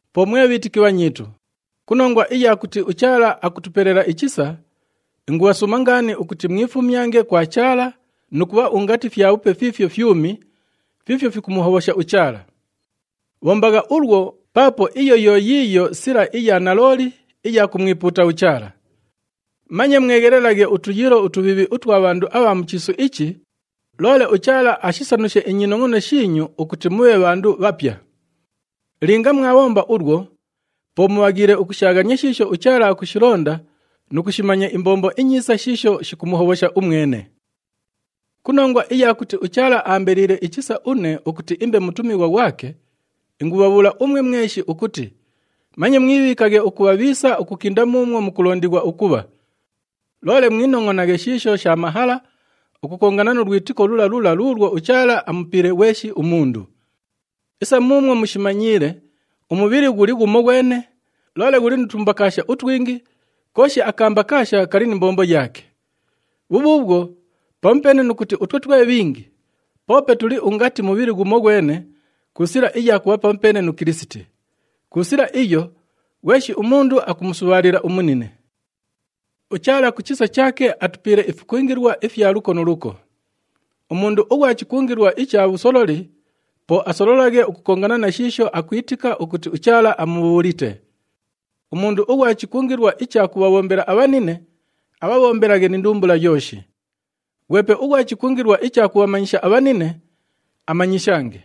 Po mwe bhiitiki bhanyiitu, ku nongwa iya kuti uChaala akutupelela ichisa, ingubhasuuma ngaani ukuti mwifumyange kwa Chaala nu kubha ungati fyabhupe fiifyo fyumi, fiifyo fikumuhobhosha uChaala. Bhombagha ulwo, paapo iyo yo yiiyo sila iya nalooli iya kumwipuuta uChaala. Manye mweghelelaghe utuyiilo utubhiibhi utwa bhandu abha mu chiisu ichi, loole uChaala ashisanushe inyinongʼono shiinyu ukuti mubhe bhandu bhapya. Linga mwabhomba ulwo, po mubhaghiile ukushaaghania shiisho uChaala akushilonda nu kushimanya imbombo inyiisa shiisho shikumuhobhosha umwene. Ku nongwa iya kuti uChaala aambeliile ichisa une ukuti imbe mutumighwa ghwake, ingubhabhuula umwe mweshi ukuti manye mwibhiikaghe ukubha bhiisa ukukinda muumwo mukulondighwa ukubha. Loole mwinongʼonaghe shiisho sha mahala ukukongana nu lwitiko lula lula luulwo uChaala amupiile ghweshi umundu. Isa muumwo mushimanyiile, umubhili ghuli ghumoghwene, loole ghuli nu tumbakaasha utwingi, kooshi akambakaasha kali ni mbombo yaake. Bhubhuubhwo, pamupeene nu kuti utwe twe bhingi, poope tuli ungati mubhili ghumoghwene ku sila iya kubha pamupeene nu Kilisiti. Ku sila iyo, ghweshi umundu akumusubhaalila umunine. UChaala ku chisa chaake, atupiile ifikungilwa ifya luko nu luko. Umundu ughwa chikungilwa icha bhusololi, po asololaghe ukukongana na shiisho akwitika ukuti uChaala amubhuulite. Umundu ughwa chikungilwa icha kubhabhombela abhanine, abhabhombelaghe ni ndumbula yooshi. Ghwepe ughwa chikungilwa icha kubhamanyisha abhanine, amanyishange.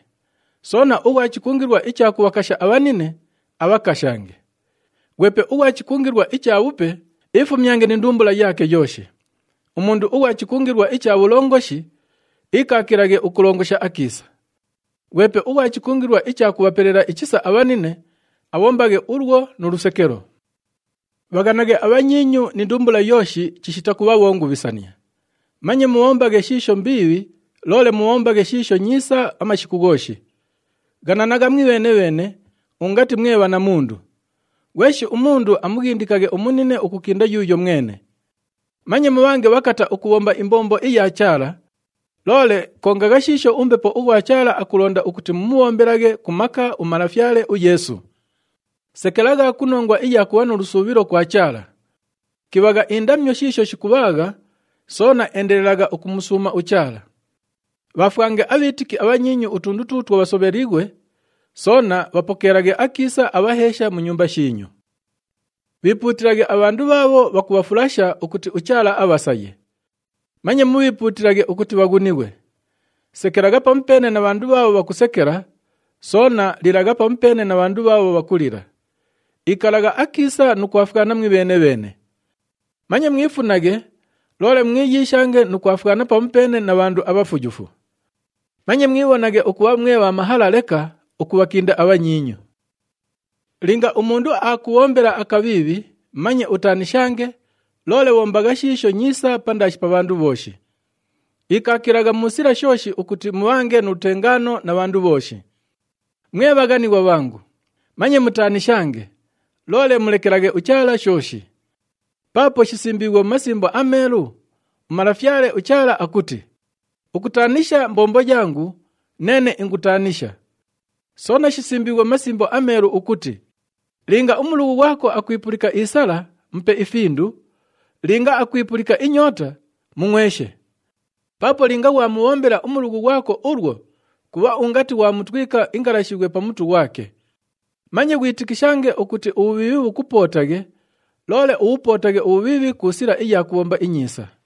Soona ughwa chikungilwa icha kubhakasha abhanine, abhakashange. Ghwepe ughwa chikungilwa icha bhupe, iifumyange ni ndumbula yaake yooshi. Umundu ughwa chikungilwa icha bhulongoshi, iikaakilaghe ukulongosha akiisa. Ghwepe ughwa chikungilwa icha kubhapelela ichisa abhanine, abhombaghe ulwo nu lusekelo. Bhaghanaghe abhanyiinyu ni ndumbula yooshi chishita kubha bhongubhisania. Manye mubhombaghe shiisho mbiibhi, loole mubhombaghe shiisho nyiisa amashiku ghooshi. Ghananagha mwibheene-bheene ungati mwe bhanamundu. Ghweshi umundu amughindikaghe umunine ukukinda yuuyo mwene. Manye mubhange bhakata ukubhomba imbombo iya Chaala, loole kongagha shiisho uMbepo ughwa Chaala akulonda ukuti mumubhombelaghe ku maka uMalafyale uYeesu. Sekelagha ku nongwa iya kubha nu lusuubhilo kwa Chaala. Kibhagha indamyo shiisho shikubhaagha, soona endelelagha ukumusuuma uChaala. Bhaafwange abhiitiki abhanyiinyu utundu tuutwo bhasobheliighwe, soona bhapokeelaghe akiisa abhaheesha mu nyumba shiinyu. Bhiipuutilaghe abhandu bhaabho bhakubhafulasha ukuti uChaala abhasaye. Manye mubhiipuutilaghe ukuti bhaghunighwe. Sekelagha pamupeene na bhandu bhaabho bhakusekela, soona lilagha pamupeene na bhandu bhaabho bhakulila. Ikalagha akiisa nu kufwana mwibheene-bheene. Manye mwifunaghe, loole mwiyiishange nu kwafwana pamupeene na bhandu abhafuyufu. Manye mwibhonaghe ukubha mwe bha mahala leka ukubhakinda abhanyiinyu. Linga umundu aakubhombela akabhiibhi, manye utaanishange, loole bhombagha shiisho nyiisa pandaashi pa bhandu bhooshi. Ikaakilagha mu sila shooshi ukuti mubhange nu lutengaano na bhandu bhooshi. Mwe bhaghanighwa bhangu, manye mutaanishange, loole mulekelaghe uChaala shooshi. Paapo shisimbiighwe mu Masimbo aMeelu, uMalafyale uChaala akuti, “Ukutaanisha mbombo yangu, neene ingutaanisha.” Soona shisimbiighwe mu Masimbo aMeelu ukuti, “Linga umulughu ghwako akwipulika isala, mupe ifindu, linga akwipulika inyoota, mungʼweshe. Paapo linga ghwamubhombela umulughu ghwako ulwo, kubha ungati ghwamutwika ingalashibhwe pa mutu ghwake.” Manye ghwitikishange ukuti ubhubhiibhi bhukupootaghe, loole ubhupootaghe ubhubhiibhi ku sila iya kubhomba inyiisa.